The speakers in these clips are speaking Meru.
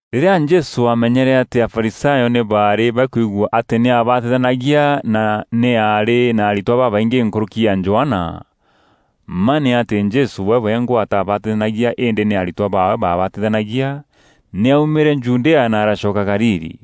Rîrîa Jesû aamenyere atî Afarisayo nî baarî bakwigua atî nî aabatithanagia na nî aarî na aritwa babaingî nkûrûki ya Johana (mma nî atî Jesû we wengwa ataabatithanagia îndî nî aritwa baawe baabatithanagia.) Nî aumîre Judea na aracoka Galili.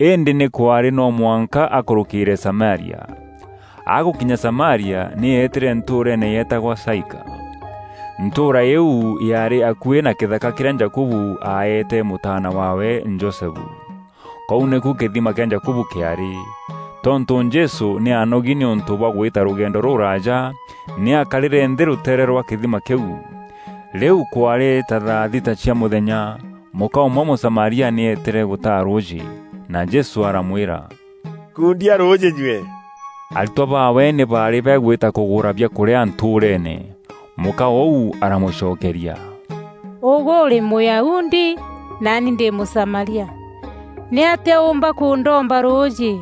Îndî nî kwaarî no mwanka akûrûkîîre Samaria. Agûkinya Samaria, nî eetîre ntûûreene yeetagwa Saika. Ntûûra îîu yaarî akuî na kîthaka kîrîa Jakubu aeete mûtaana waawe Josefu. Kûu nîku kîthima kîa Jakubu kîaarî. Tontû Jesû nî aanogi nîûntû bwa gwîta rûgendo rûrûraaja, nî aakarîre nthî rûteere rwa kîthima kîu. Rîu kwaarî ta thaa thita cia mûthenya. Mûka ûmwe Mûsamaria nî eetîre gûtaa rûûjî, na Jesû aramwîra, “Nkundia rûûjî nyue.” Aritwa baawe nî baarî bagwîta kûgûra biakûrîa ntûûreene. Mûka ûu aramûcokeria, “Ûgwe ûrî Mûyahudi, naani ndî Mûsamaria! Nîatîa ûûmba kûndomba rûûjî?”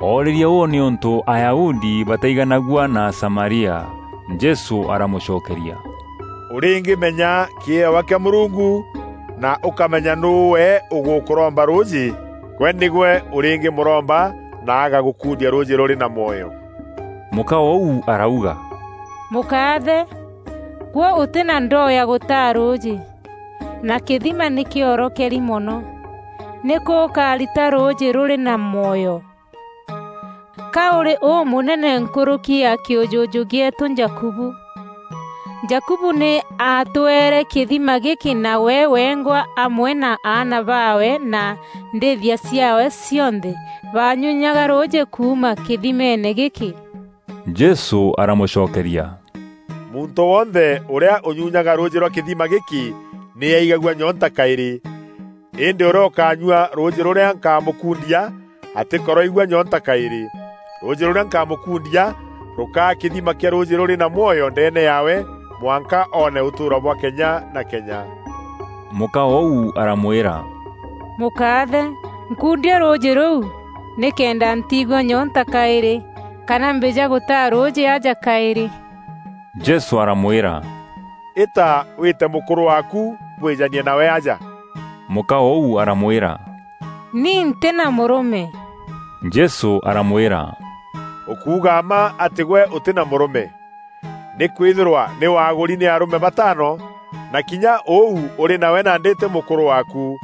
Oorîrie ûû nîûntû Ayahudi bataiganagua na Asamaria. Jesû aramûcokeria, “Ûrîngîmenya kîewa kîa Mûrungu, na ûkamenya nûû we ûgûkûromba rûûjî, gwe nîgwe ûrîngîmûromba na agagûkundia rûûjî rûrî na mwoyo.” Mûka ûu arauga, “Mûkaathe, gwe ûtî na ndoo ya gûtaa rûûjî, na kîthima nî kîorokeri mono. Nîkû ûkarita rûûjî rûrî na mwoyo? Ka ûrî ûmûnene nkûrûki ya kîûjûjû gîeetû Jakubu? Jakubu nî aatweere kîthima gîkî na we wengwa amwe na aana baawe na ndîîthia ciaawe cionthe baanyunyaga rûûjî kuuma kîthimeene gîkî.” Jesû aramûcokeria, “Muntû wonthe ûrîa ûnyunyaga rûûjî rwa kîthima gîkî nî aigagua nyoonta kaîrî. Îndî ûrîa ûkaanyua rûûjî rûrîa nkamûkundia, atîkoroigua nyoonta kaîrî. Rûûjî rûrîa nkamûkundia rûkaa kîthima kîa rûûjî rûrî na mwoyo ndeene yaawe mwanka oone ûtûûro bwa kenya na kenya.” Mûka ûu aramwîra, “Mûkaathe, nkundia rûûjî rûu nîkenda ntiigua nyoonta kaîrî, kana mbîja gûtaa rûûjî aja kaîrî.” Jesû aramwîra, “Îta wîte mûkûrû waaku, bwîjanie nawe aja.” Mûka ûu aramwîra, “Ni ntî na mûrûme.” Jesû aramwîra, “Ûkuuga mma atî gwe ûtî na mûrûme. Nîkwîthîrwa nî waagûri nî arûme bataano, na kinya ûu ûrî nawe nandî tî mûkûrû waaku.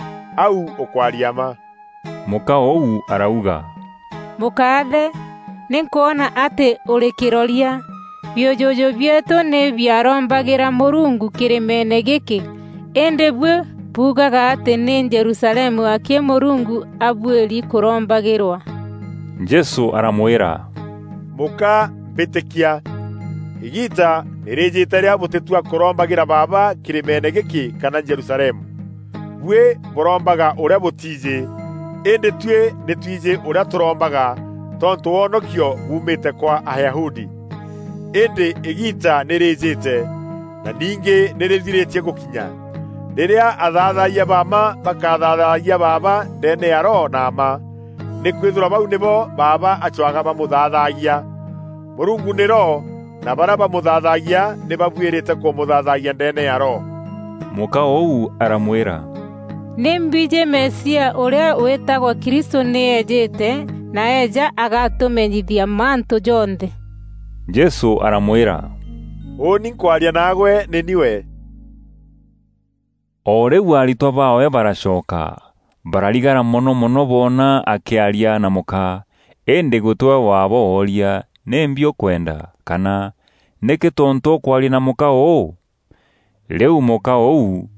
Au ûkwaria mma.” Mûka ûu arauga, “Mûkaathe, nî nkwona atî ûrî kîroria. Biûjûjû bieetû nî biarombagîra Mûrungu kîrîmeene gîkî îndî buî buugaga atî nî Jerusalemu akî Mûrungu abuîri kûrombagîrwa.” Jesû aramwîra, “Mûka, mbîtîkia; îgiita nî rîîjîte rîrîa bûtîtua kûrombagîra Baaba kîrîmeene gîkî kana Jerusalemu. Buî bûrombaga ûrîa bûtiijî, îndî tuî nî twijî ûrîa tûrombaga, tontû wonokio buumîte kwa Ayahudi. Îndî îgiita nî rîîjîte; na ningî nî rîthirîtie gûkinya, rîrîa athaathayia ba mma bakathaathayia Baaba ndeene ya Roho na mma, nî kwîthîrwa bau nîbo Baaba acwaga bamûthaathagia. Mûrungu nî Roho na barîa bamûthaathagia nî babuîrîte kûmûthaathayia ndeene ya Roho.” Mûka ûu aramwîra, “Nî mbijî Mesia, ûrîa wîtagwa Kristû nî ejîte, na eeja agatûmenyithia mantû jonthe.” Jesû aramwîra, “Ûûni nkwaria nagwe nî ni we.” O rîu aritwa baawe baracoka. Bararigara mono mono boona akîaria na mûka. Îndî gûtîwe waabo wooria, “Nîmbi ûkwenda?” Kana, “Nîkî tontû ûkwaria na mûka ûû?” Rîu mûka ûu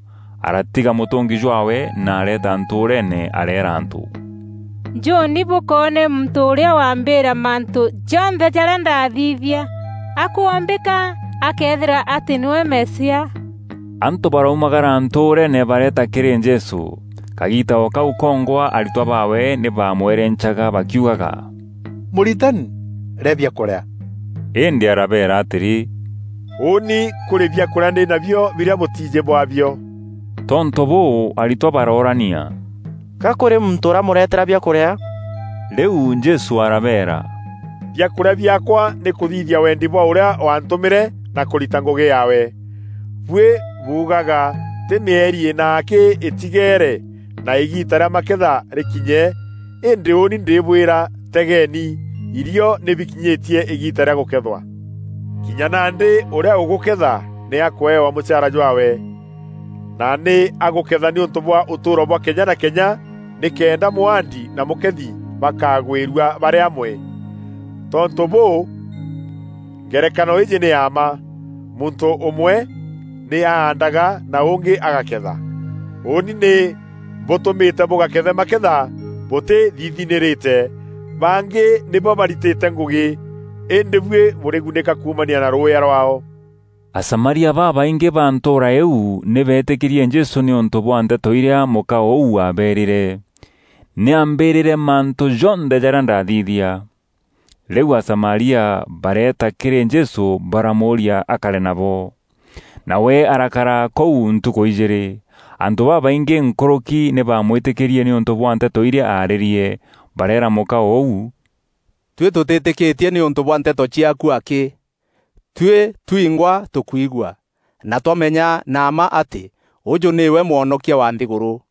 aratiga mûtûngi jwaawe, na areeta ntûûreene areera antû, “Njûni bûkoone muntû ûrîa wambîîra mantû jonthe jarîa ndaathithia. A kwombîka akeethîrwa atî nîwe Mesia?” Antû baraumagara ntûûreene bareeta kîrî Jesû. Kagiita o kau kongwa aritwa baawe nî bamwerencaga bakiugaga, “Mûritani, rîa biakûrîa.” Îndî arabeera atîrî, “Ûûni kûrî biakûrîa ndî nabio birîa bûtiijî bwaabio.” Tontû bûû, aritwa baroorania, “Ga kûrî muntû ûramûretera biakûrîa?” Rîu Jesû arabeera, “Biakûrîa biaakwa nî kûthithia wendi bwa ûrîa waantûmîre na kûrita ngûgî yaawe. Buî buugaga: ‘Tî mîeri îna akî îtigeere, na îgiita rîa maketha rîkinye!’ Îndî ûûni ndîbwîra, tegeeni, irio nî bikinyîtie îgiita rîa gûkethwa. Kinya nandî ûrîa ûgûketha nî akwewa mûchaara jwaawe, na nî agûketha nîûntû bwa ûtûûro bwa kenya na kenya nîkenda mwaandi na mûkethi bakagwîrua barî amwe. Tontû bûû, ngerekano îîjî nî ya mma: ‘Muntû ûmwe nî aandaga na ûngî agaketha.’ Ûûni nî mbûtûmîte bûgakethe maketha bûtîthithinîrîte. Bangî nîbo baritîte ngûgî, îndî buî bûrigunîka kuumania na rûûya rwaao.” Asamaria babaingî ba ntûûra îîu nî beetîkîrie Jesû nîûntû bwa nteto irîa mûka ûu aabeerîre, “Nî ambîîrîre mantû jonthe jarîa ndaathithia.” Rîu Asamaria bareeta kîrî Jesû baramûûria akare nabo; nawe arakara kûu ntukû ijîîrî. Antû babaingî nkûrûki nî bamwîtîkîrie nîûntû bwa nteto iria aarîrie. Bareera mûka ûu, “Tuî tûtîîtîkîtie nîûntû bwa nteto ciaaku akî, tuî twingwa tûkwigua, na twamenya na mma atî ûûjû nîwe Mwonokia wa nthîgûrû.”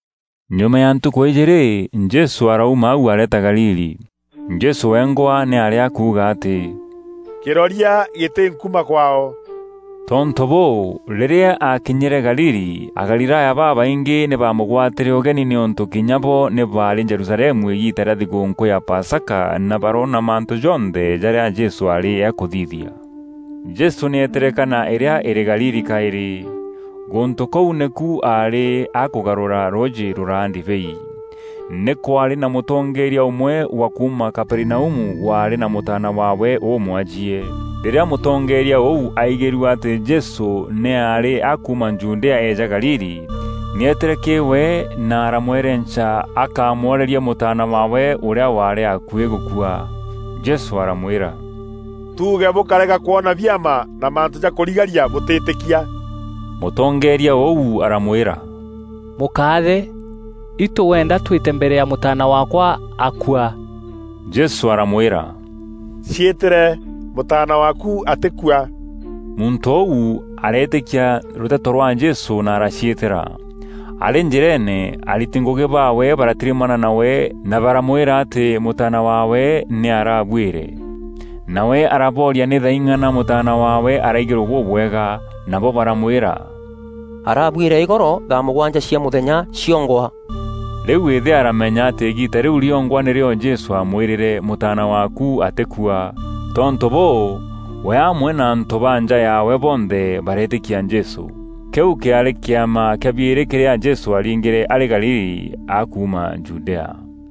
Nyuma ya ntukû ijîîrî, Jesû arauma au areeta Galili. Jesû wengwa nî aarî akûûga atî “Kîroria gîtî, nkuma kwaao.” Tontû bûû, rîrîa aakinyîre Galili, Agalilaya babaingî nî baamûgwatîre ûgeni nîûntû kinya bo nî baarî Jerusalemu îgiita rîa thigûûnkû ya Pasaka na baroona mantû jonthe jarîa Jesû aarî akûthithia. Jesû nî eetîre Kana îrîa îrî Galili kaîrî. Gûntû kûu nîku aarî akûgarûra rûûjî rûraa ndibei. Nî kwaarî na mûtongeeria ûmwe wa kuuma Kaperinaumu waarî na mûtaana waawe ûûmwajie. Rîrîa mûtongeeria ûu aaigîrue atî Jesû nî aarî akuuma Judea eeja Galili, nî eetîre kîrî we na aramwerenca akamworerie mûtaana waawe ûrîa waarî akuî gûkua. Jesû aramwîra, “Tuuge bûkarega kwona biama na mantû ja kûrigaria bûtîtîkia?” Mûtongeeria ûu aramwîra, “Mûkaathe, itû wenda twîte mbere ya mûtaana waakwa akua.” Jesû aramwîra, “Ciîtîre, mûtaana waaku atîkua.” Muntû ûu areetîkia rûteto rwa Jesû na araciîtîra. Arî njîreene ariti ngûgî baawe baratirimana nawe na baramwîra atî mûtaana waawe nî arabuîre. Nawe arabooria nî thaa ing'ana mûtaana waawe araigîrue bûbwega. Nabo baramwîra, “Arabuîre îgoro thaa mûgwanja cia mûthenya ciongwa.” Rîu îthe aramenya atî îgiita rîu rîongwa nîrîo Jesû aamwîrîre; “Mûtaana waaku atîkua.” Tontû bûû, we amwe na antû ba nja yaawe bonthe bareetîkia Jesû. Kîu kîaarî kîama kîa biîrî kîrîa Jesû aaringîre arî Galili akuuma Judea.